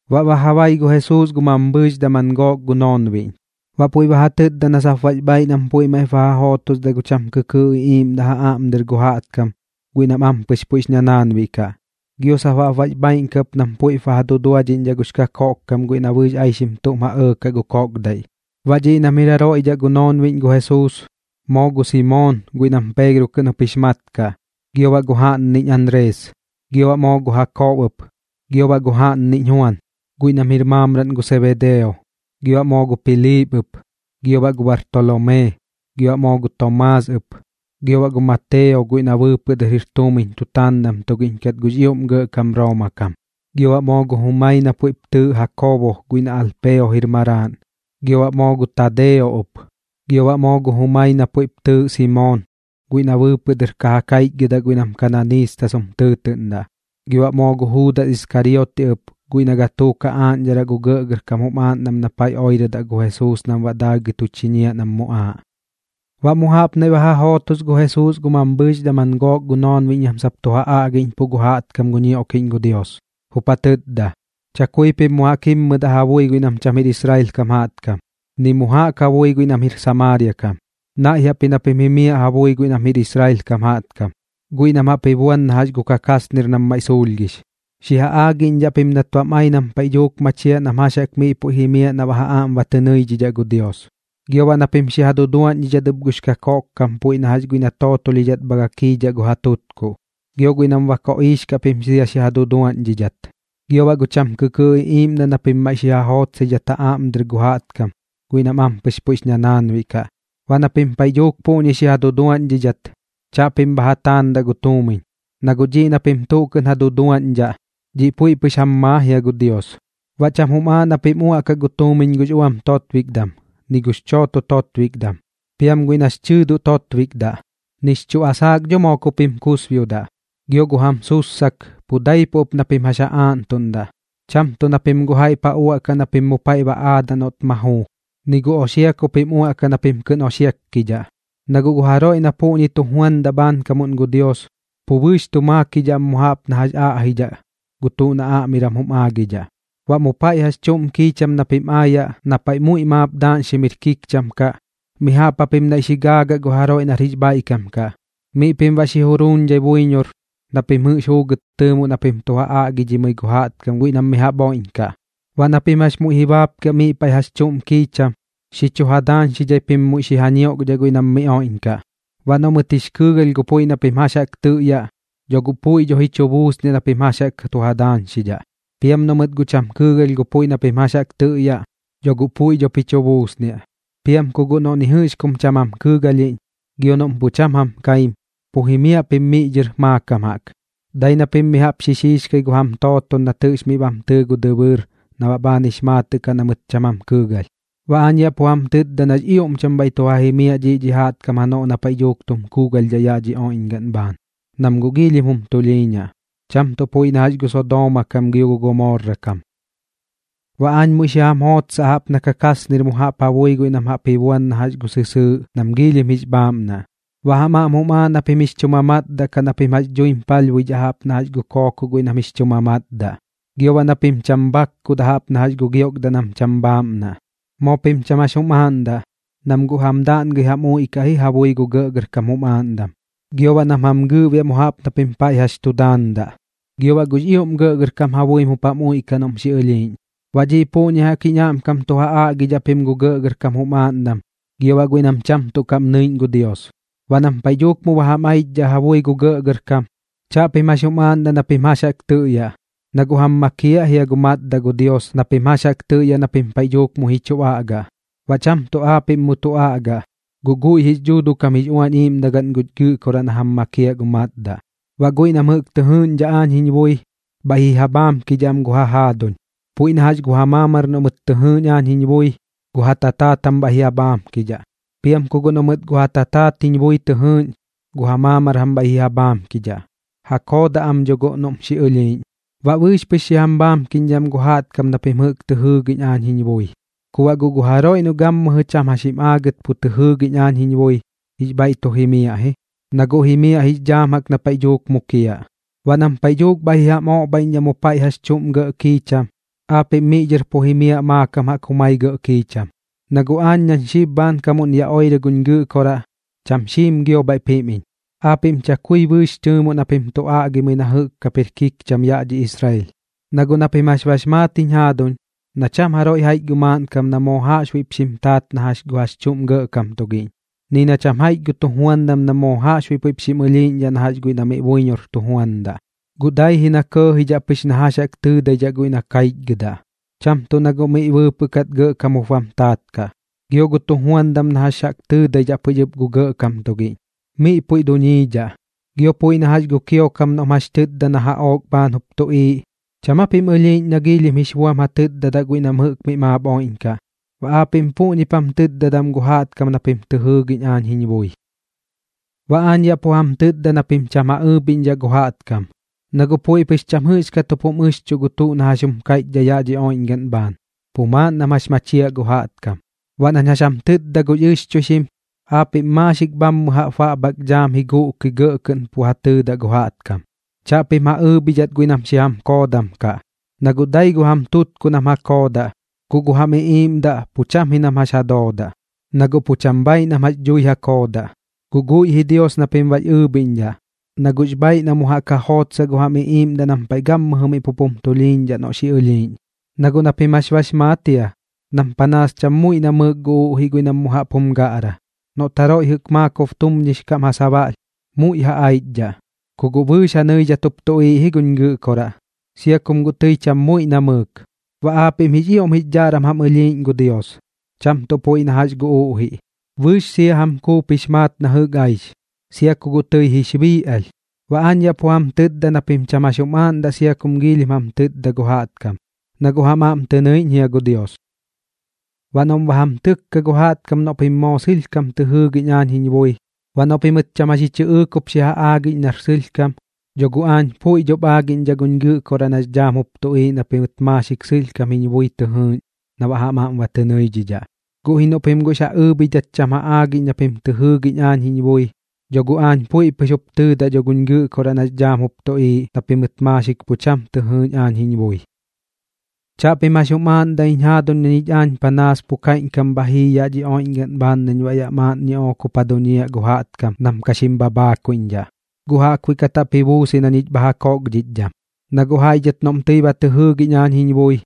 Baꞌ ba ja bai gu Jesuus gu mambhɨɨx daman gook gu noonbiꞌñ, baꞌ puiꞌ ba ja tɨtda na sap bax bhaaiꞌ nam puiꞌ maiꞌp ba ja jootosdaꞌ gu cham kɨkɨɨꞌ iꞌiiꞌmdaꞌ ja aꞌm dɨr gu jaꞌtkam guiꞌ nam ampɨx puiꞌx ñanaanbiꞌ kaꞌ, gio sap baꞌ bax bhaaiꞌn kaꞌ ɨp nam puiꞌp ba ja duduadhiꞌñdhaꞌ gux kakoꞌkkam guiꞌ na bɨɨx aixim tuꞌm ja ɇɇkaꞌ gu koꞌkdaiꞌ. Baꞌ dhiꞌ nam jir jaroiꞌ dhaꞌ gu noonbiꞌñ gu Jesuus: Moo gu Simoon guiꞌ nam Peegro kɨꞌn jup jix mat kaꞌ, gio baꞌ gu jaꞌnniꞌñ Anrees. Gio baꞌ moo gu Jakoobo ɨp, gio baꞌ gu jaꞌnniꞌñ Juan, guiꞌ nam jir maamraꞌn gu Sebedeo. Gio baꞌ moo gu Piliip ɨp, gio baꞌ gu Bartolomee, gio baꞌ moo gu Tomaas ɨp. Gio baꞌ gu Mateo guiꞌ na bɨɨpɨꞌ dɨr jir tuumiñ tutaandam tugiꞌñ kat gux ioꞌm gɇꞌkam Rooma kam. Gio baꞌ moo gu jumai na puiꞌp tɨɨꞌ Jakoobo guiꞌ na Alpeo jir maraaꞌn, gio baꞌ moo gu Tadeo ɨp. Gio baꞌ moo gu jumai na puiꞌp tɨɨꞌ Simoon guiꞌ na bɨɨpɨꞌ dɨr ka ja kaichgɨdaꞌ guiꞌ nam Kananiistas jum tɨɨtɨꞌndaꞌ. Gio baꞌ moo gu Juudas Iskarioti ɨp guiꞌ na gatuuk ja aaꞌñdharaꞌ gu gɇꞌgɇrkam jum aaꞌndam na paiꞌ oirɨdaꞌ gu Jesuus nam baꞌ daagɨi tu chiñiaꞌ nam muꞌaaꞌ. Baꞌ mu jaꞌp naiꞌ ba ja jootos gu Jesuus gu mambhɨɨx daman gook gu noonbiꞌñ nam sap tu ja aꞌgiꞌñpuꞌ gu jaꞌtkam gu ñioꞌkiꞌñ gu Dios, jup ja tɨtda: ―Chakui pim mu jaꞌk jimmɨdaꞌ ja bui guiꞌ nam cham jir Israel kam jaꞌtkam, ni mu jaꞌk ja bui guiꞌ nam jir Samaaria kam. Naiꞌ jaꞌp ji na pim jimiaꞌ ja bui guiꞌ nam jir Israel kam jaꞌtkam, guiꞌ nam jaꞌp ji buan na jax gu kakasnir nam maiꞌ suulhgix. Xi ja aagiꞌñdhaꞌ pim nat bam ai nam paiꞌ dhuuk machiaꞌ nam jax jaꞌk miꞌ puiꞌ jimiaꞌ na baꞌ ja aꞌm ba tɨ nɨidhidhaꞌ gu Dios. Gio baꞌ na pim xi ja duduaꞌñdhidhat ɨp gux kakoꞌkkam puiꞌ na jax guiꞌ na tootolhidhat bha gakiidhaꞌ gu ja tutkuꞌ. Gio guiꞌ nam ba koꞌiix kaꞌ pim sia xi ja duduaꞌñdhidhat. Gio baꞌ gu cham kɨkɨɨꞌ iꞌiiꞌmdaꞌ na pim maiꞌ ja jootsaidhaꞌ ja aꞌm dɨr gu jaꞌtkam guiꞌ nam ampɨx puiꞌx ñanaanbiꞌ kaꞌ. Baꞌ na pim paiꞌ dhuuk puꞌñi xi ja duduaꞌñdhidhat, chaꞌpim bha ja taandaꞌ gu tuumiñ, na guꞌ dhiꞌ na pim tuꞌ kɨꞌn ja duduaꞌñdhaꞌ, dhiꞌ puiꞌ pɨx jam maa jia gu Dios. ’Baꞌ cham jum aaꞌ na pim uaꞌkaꞌ gu tuumiñ gux uam totbikdam, ni gux chooto totbikdam, piam guiꞌ nax chɨɨdoꞌ totbikdaꞌ. Nix chuꞌ asaak dho moo ku pim kusbiodaꞌ, gio gu jam sussak pu daipuꞌ ɨp na pim jax ja aaꞌntuꞌndaꞌ, cham tuꞌ na pim guꞌ jaiꞌp ja uaꞌkaꞌ na pim mu paiꞌ ba aadaꞌ noꞌt ma juu. Ni gu oxia ku pim uaꞌkaꞌ na pim kɨꞌn oxiakkidhaꞌ, na guꞌ gu jaroiꞌ na puꞌñi tu juandaꞌ bhaankam gu Dios, pu bɨɨx tu makiidhaꞌ am mu jaꞌp na jax aꞌjidhaꞌ gu tuꞌ na aꞌmiram jum aagidhaꞌ. ’Baꞌ mu paiꞌ jax chuꞌm kiicham na pim aayaꞌ na paiꞌ muiꞌ maap daaꞌñxim jir kikcham kaꞌ, mi jaꞌp japim naiꞌ xi gaagaꞌ gu jaroiꞌ nar jix bhaiꞌkam kaꞌ, miꞌ pim baꞌ xi juruuñdhai buiñor na pim jɨꞌx juugɨt tɨɨmoꞌ na pim tu ja aꞌgidhimɨi gu jaꞌtkam guiꞌ nam mi jaꞌp oiꞌñkaꞌ. Baꞌ na pim jax muiꞌ ji baapkiaꞌ miꞌ paiꞌ jax chuꞌm kiicham, xi chu ja daañxidhai pim muiꞌ xi ja ñioꞌkdhaꞌ guiꞌ nam miꞌ oiꞌñkaꞌ. Baꞌ noꞌ mɨt jix kɨɨgalh gu puiꞌ na pim jax tɨꞌyaꞌ, dho guꞌ puiꞌ dho ji chu buusniaꞌ na pim jax jaꞌk tu ja daañxidhaꞌ. Piam noꞌ mɨt guꞌ cham kɨɨgalh gu puiꞌ na pim jax tɨꞌyaꞌ, dho guꞌ pu cham dho puiꞌ ji chu buusniaꞌ. Piam ku guꞌ noꞌ ni jɨꞌx kum cham jam kɨɨgalhiꞌñ, gio noꞌm pu cham jam kaim, pu jimiaꞌ pim miꞌ dhɨr maakam jaꞌk, dai na pim mi jaꞌp xi xiixkai gu jam tooton nat jɨꞌx miꞌ bam tɨɨ gu dɨbɨɨr na baꞌ bhaan jix maatɨꞌ kaꞌ na mɨt cham jam kɨɨgalh. Baꞌ aañ yaꞌ pu jam tɨtda nax ioꞌm cham bhaiꞌ tu ja jimiaꞌ dhiꞌ dhi jaꞌtkam janoꞌ na paiꞌ dhuuk tum kuugalhdhaꞌ yaꞌ dhi oiꞌñgaꞌn bhaan, nam guꞌ giilhim jum tulhiiñaꞌ, cham tuꞌ puiꞌ na jax gu Sodooma kam gio gu Gomorra kam. ’Baꞌ aañ muiꞌ xi jam jootsaꞌ jaꞌp na kakasnir mu jaꞌp ja bui guiꞌ nam jaꞌp ji buan na jax gu sɨsɨɨꞌ nam giilhim jix bhaaꞌmnaꞌ. Baꞌ jam aꞌm jum aaꞌ na pim jix chu matdaꞌ kaꞌ na pim jax dhuim palhbuidhaꞌ jaꞌp na jax gu kookoꞌ guiꞌ nam jix chu mamatdaꞌ, gio baꞌ na pim cham bhakkudaꞌ jaꞌp na gu giokdaꞌ nam cham bhaaꞌmnaꞌ. Moo pim cham jax jum aaꞌndaꞌ, nam guꞌ jam daꞌngɨi jam uiꞌkaꞌ ji ja bui gu gɇꞌgɇrkam jum aaꞌndam, gio baꞌ nam jam gɨɨꞌbiaꞌ mu jaꞌp nam paiꞌ jax tu daandaꞌ. Gio baꞌ gux ioꞌm gɇꞌgɇrkam ja buim jup jam uiꞌkaꞌ noꞌm xi ɨlhiiꞌñ. Baꞌ dhi puꞌñi jaꞌk jiñ aꞌmkam tu ja aꞌgidhaꞌ pim gu gɇꞌgɇrkam jum aaꞌndam gio baꞌ guiꞌ nam cham tuꞌ kaꞌm nɨiꞌñ gu Dios. Baꞌ nam paiꞌ dhuuk mu ba jam aichdhaꞌ ja bui gu gɇꞌgɇrkam, chaꞌpim jax jum aaꞌndaꞌ na pim jax jaꞌk tɨꞌyaꞌ, na guꞌ jam makiaꞌ jia gu matdaꞌ gu Dios na pim jax jaꞌk tɨꞌyaꞌ na pim paiꞌ dhuuk muiꞌ ji chu aꞌgaꞌ. Baꞌ cham tuꞌ aapiꞌm mu tu aꞌgaꞌ, guꞌ guiꞌ jix Dhuuduꞌ kam jix Uañ Iiꞌmdagaꞌn guñ Gɨꞌkoraꞌ na jam makiaꞌ gu matdaꞌ. ’Baꞌ guiꞌ nam jɨꞌk tɨ jɨɨꞌñdhaꞌ aañ jiñ bui, bhaiꞌ ji ja bhaamkidhaꞌ am gu ja jaaduñ. Puiꞌ na jax gu ja maamar noꞌ mɨt tɨ jɨɨꞌñ aañ jiñ bui, gu ja tataat jam bhaiꞌp ji ja bhaamkidhaꞌ. Piam ku guꞌ noꞌ mɨt gu ja tataat jiñ bui tɨ jɨɨꞌñ, gu ja maamar jam bhaiꞌp ji ja bhaamkidhaꞌ, ja koodaꞌ am dho guꞌ noꞌm xi ɨlhiiꞌñ. Baꞌ bɨɨx pɨx xi jam bhaamkiꞌñdhaꞌ am gu jaꞌtkam na pim jɨꞌk tɨ jɨɨgiꞌñ aañ jiñ bui. Ku baꞌ guꞌ gu jaroiꞌ noꞌ gammɨjɨ cham jax jim aagɨt pu tɨ jɨɨgiꞌñ aañ jiñ bui, jix bhaiꞌ tu jimiaꞌ ji, na guꞌ jimiaꞌ jix dhaam jaꞌk na paiꞌ dhuuk mukiaꞌ. Baꞌ nam paiꞌ dhuuk bhaiꞌ ji jam oꞌbhaiꞌñdhaꞌ mu paiꞌ jax chuꞌm gɇꞌ kiicham, aapiꞌm miꞌ dhɨr pu ji jimiaꞌ maakam jaꞌk jumai gɇꞌ kiicham, na guꞌ aañ nañ xib bhaankamuꞌn yaꞌ oirɨ guñ Gɨꞌkoraꞌ, cham xiim gio bhaiꞌp jim iñ, aapiꞌm chakui bɨɨx tɨɨmoꞌ na pim tu aꞌgimɨi na jɨꞌk kap jir kikcham yaꞌ dhi Israel. ’Na guꞌ na pim jax bax maat jiñ jaaduñ, na cham jaroiꞌ jaiꞌch gu maaꞌnkam na moo jaꞌxbuiꞌp xim taat na jax gu jax chuꞌm gɇꞌkam tugiꞌñ, ni na cham jaiꞌch gu tujuandam na moo jaꞌxbuiꞌ puiꞌp xim ɨlhiiꞌñdhaꞌ na jax guiꞌ na miꞌ buiñor tujuandaꞌ. Guꞌ dai ji na kɇɇjidhaꞌ pɨx na jax jaꞌk tɨɨdaidhaꞌ guiꞌ na kaichgɨdaꞌ, cham tuꞌ na guꞌ miꞌ bɨɨpɨꞌ kat gɇꞌkam jup bam taat kaꞌ, gio gu tujuandam na jax jaꞌk tɨɨdaidhaꞌ pɨx ɨp gu gɇꞌkam tugiꞌñ, miꞌ puiꞌ duñiidhaꞌ. Gio puiꞌ na jax gu kiokam noꞌm jax tɨtda na jaꞌook bhaan jup tuꞌiiꞌ, ¿cham aa pim ɨlhiiꞌñ nam giilhim jix buam ja tɨtdadaꞌ guiꞌ nam jɨꞌk maap miꞌ oiꞌñkaꞌ? Baꞌ aapiꞌm puꞌñip jam tɨtdadaꞌ am gu jaꞌtkam na pim tɨ jɨɨgiꞌñ aañ jiñ bui. ’Baꞌ aañ yaꞌ pu jam tɨtda na pim cham ja ɨɨbhiꞌñdhaꞌ gu jaꞌtkam, na guꞌ puiꞌ pɨx cham jɨꞌxkat jup jum ɨxchuꞌ gu tuꞌ na jax jum kaiꞌchdhaꞌ yaꞌ dhi oiꞌñgaꞌn bhaan, pu maaꞌn nam jax machiaꞌ gu jaꞌtkam. Baꞌ nañ jax jam tɨtdadaꞌ gux ɨxchuixim, aapiꞌm maaxik bhaamɨ jaꞌp baꞌbhak dhaam xi guꞌkɨi gɇꞌ kɨꞌn pu ja tɨɨdaꞌ gu jaꞌtkam. Chaꞌpim ja ɨɨbhidhat guiꞌ nam xi jam koodam kaꞌ, na guꞌ dai gu jam tutkuꞌ nam jam koodaꞌ, guꞌ gu jam iꞌiiꞌmdaꞌ pu cham ji nam jax ja doodaꞌ, na guꞌ pu cham bhaaiꞌ nam jax dhui ja koodaꞌ. Guꞌ guiꞌ ji Dios na pim baꞌx ɨɨbhiꞌñdhaꞌ, na guꞌx bhaaiꞌ na mu jaꞌk ja jootsaꞌ gu jam iꞌiiꞌmdaꞌ nam paiꞌ gammɨjɨ miꞌ pup jum tulhiiñdhaꞌ noꞌ xi ɨlhiiꞌñ. ’Na guꞌ na pim jax bax maat jia, nam panaas cham muiꞌ namɨɨk gu uꞌjiꞌ guiꞌ nam mu jaꞌp jum gaꞌra. Noꞌt jaroiꞌ jɨꞌk maakob tumñix kaꞌm ja sabaꞌlh, muiꞌ ja aichdhaꞌ. Ku guꞌ bɨɨx ja nɨidhat jup tuꞌiiꞌ ji guñ Gɨꞌkoraꞌ, sia kum guꞌ tɨi cham muiꞌ namɨɨk. Baꞌ aapiꞌm jix ioꞌm jix dhaꞌram jam ɨlhiiꞌñ gu Dios, cham tuꞌ puiꞌ na jax gu uꞌjiꞌ. Bɨɨx sia jam kuup jix maat na jɨꞌk aix, sia ku guꞌ tɨix bii alh. Baꞌ aañ yaꞌ pu jam tɨtda na pim cham jax jum aaꞌndaꞌ sia kum giilhim jam tɨtda gu jaꞌtkam, na guꞌ jam aꞌm tɨ nɨiꞌñ jia gu Dios. ’Baꞌ noꞌm ba jam tɨkka gu jaꞌtkam noꞌ pim moo sɨlhkam tɨ jɨɨgiꞌñ aañ jiñ bui, baꞌ noꞌ pimɨt cham jax ji chɨꞌɨɨk jup xi ja aagiꞌñ nar sɨlhkam, dho guꞌ aañ puiꞌ dhop aagiꞌñdhaꞌ guñ Gɨꞌkoraꞌ nax dhaam jup tuꞌiiꞌ na pim maaxik sɨlhkam jiñ bui tɨ jɨɨgiꞌñ na baꞌ jam aꞌm tɨ nɨidhidhaꞌ. Guꞌ ji noꞌ pim guꞌx ja ɨɨbhidhat cham ja aagiꞌñ na pim tɨ jɨɨgiꞌñ aañ jiñ bui, dho guꞌ aañ puiꞌ pɨx jup tɨɨdaꞌ dho guñ Gɨꞌkoraꞌ nax dhaam jup tuꞌiiꞌ na pim maaxik pu cham tɨ jɨɨgiꞌñ aañ jiñ bui. ’Chaꞌpim jax jum aaꞌndaꞌ jiñ jaaduñ na ñich aañ panaas pu kaiꞌñkam bha jii yaꞌ dhi oiꞌñgaꞌn bhaan nañ baꞌ yaꞌ maaꞌn ñiꞌook jup ja duñiaꞌ gu jaꞌtkam nam ka xim bhabhaakuiꞌñdhaꞌ, guꞌ jaꞌkbuiꞌ kat jaꞌp ji buus ji na ñich bha ja kookdhichdham. Na guꞌ jaiꞌ dhɨt noꞌm tɨi ba tɨ jɨɨgiꞌñ aañ jiñ bui,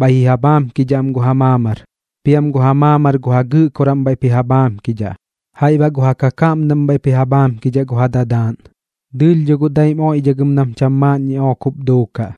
bhaiꞌ ji ja bhaamkidhaꞌ am gu ja maamar, piam gu ja maamar gu ja gɨꞌkoraꞌm bhaiꞌp ji ja bhaamkidhaꞌ, jaiꞌ baꞌ gu ja kakaꞌmdaꞌm bhaiꞌp ji ja bhaamkidhaꞌ gu ja dadaaꞌn. Dɨɨlh dho guꞌ daim oiꞌdhagɨm nam cham maaꞌn ñiꞌook jup duukaꞌ.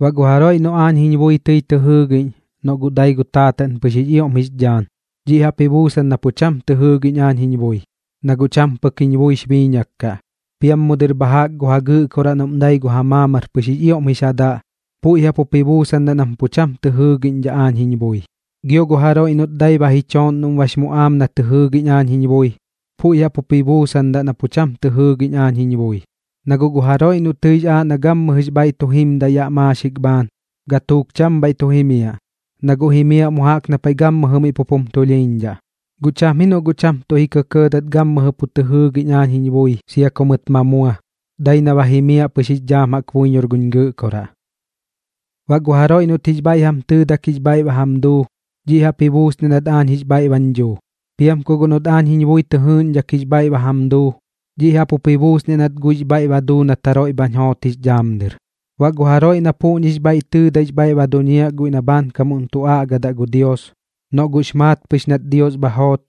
’Baꞌ gu jaroiꞌ noꞌ aañ jiñ bui tɨi tɨ jɨɨgiꞌñ, noꞌ guꞌ dai gu taataꞌn pɨx jix ioꞌm jix dhaan, dhiꞌ jaꞌp ji buusan na pu cham tɨ jɨɨgiꞌñ aañ jiñ bui, na guꞌ cham pɨk jiñ buix biiñak kaꞌ. Piam mu dɨr bha jaꞌk gu ja gɨꞌkoraꞌ noꞌm dai gu ja maamar pɨx jix ioꞌm jix ja daꞌ, puiꞌ jaꞌp jup ji buusan nam pu cham tɨ jɨɨgiꞌñdhaꞌ aañ jiñ bui. Gio gu jaroiꞌ noꞌt dai ba ji chooꞌn noꞌm bax muꞌaam na tɨ jɨɨgiꞌñ aañ jiñ bui, puiꞌ jaꞌp jup ji buusandaꞌ na pu cham tɨ jɨɨgiꞌñdhaꞌ aañ jiñ bui. Na guꞌ gu jaroiꞌ noꞌ tɨix aaꞌ na gammɨjɨx bhaiꞌ tu jimdaꞌ yaꞌ maaxik bhaan, gatuuk cham bhaiꞌ tu jimiaꞌ, na guꞌ jimiaꞌ mu jaꞌk na paiꞌ gammɨjɨ miꞌ pup jum tulhiiñdhaꞌ. Guꞌ cham ji noꞌ guꞌ cham tuꞌ ji kɇkɇɇdat gammɨjɨ pu tɨ jɨɨgiꞌñ aañ jiñ bui sia ku mɨt ma mua, dai na ba jimiaꞌ pɨx jix dhaam jaꞌk buiñor guñ Gɨꞌkoraꞌ. ’Baꞌ gu jaroiꞌ noꞌt jix bhaiꞌ jam tɨɨdak jix bhaiꞌ ba jam duu, dhiꞌ jaꞌp ji buusniaꞌ nat aañ jix bhaiꞌ bañ dhuu. Piam ku guꞌ noꞌt aañ jiñ bui tɨ jɨɨꞌñdhak jix bhaiꞌ ba jam duu, dhiꞌ jaꞌp jup ji buusniaꞌ nat guiꞌx bhaiꞌ ba duu nat jaroiꞌ bhañ joot jix dhaam dɨr. Baꞌ gu jaroiꞌ na puꞌñix bhaiꞌ tɨɨdaix bhaiꞌ ba duñiaꞌ guiꞌ na bhaankam tu aꞌgadaꞌ gu Dios, noꞌ guꞌx maat pɨx nat Dios bha joot,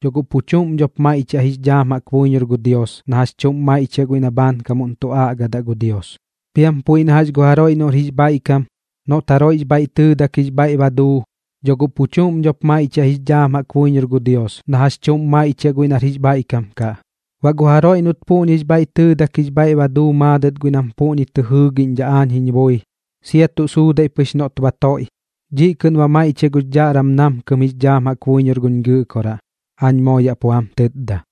dho guꞌ pu chuꞌm dhop maiꞌchiaꞌ jix dhaam jaꞌk buiñor gu Dios na jax chuꞌm maiꞌchiaꞌ guiꞌ na bhaankamuꞌn tu aꞌgadaꞌ gu Dios. Piam puiꞌ na jax gu jaroiꞌ noꞌr jix bhaiꞌkam, noꞌt jaroiꞌx bhaiꞌ tɨɨdak jix bhaiꞌ ba duu, dho guꞌ pu chuꞌm dhop maiꞌchiaꞌ jix dhaam jaꞌk buiñor gu Dios na jax chuꞌm maiꞌchiaꞌ guiꞌ nar jix bhaiꞌkam kaꞌ. Baꞌ gu jaroiꞌ noꞌt puꞌñix bhaiꞌ tɨɨdak jix bhaiꞌ ba duu maadɨt guiꞌ nam puꞌñi tɨ jɨɨgiꞌñdhaꞌ aañ jiñ bui, sia tuꞌ suudaiꞌ pɨx noꞌt ba toiꞌ, dhiꞌ kɨꞌn ba maiꞌchiaꞌ gux dhaꞌram namkɨm jix dhaam jaꞌk buiñor guñ Gɨꞌkoraꞌ, aañ moo yaꞌ pu jam tɨtda.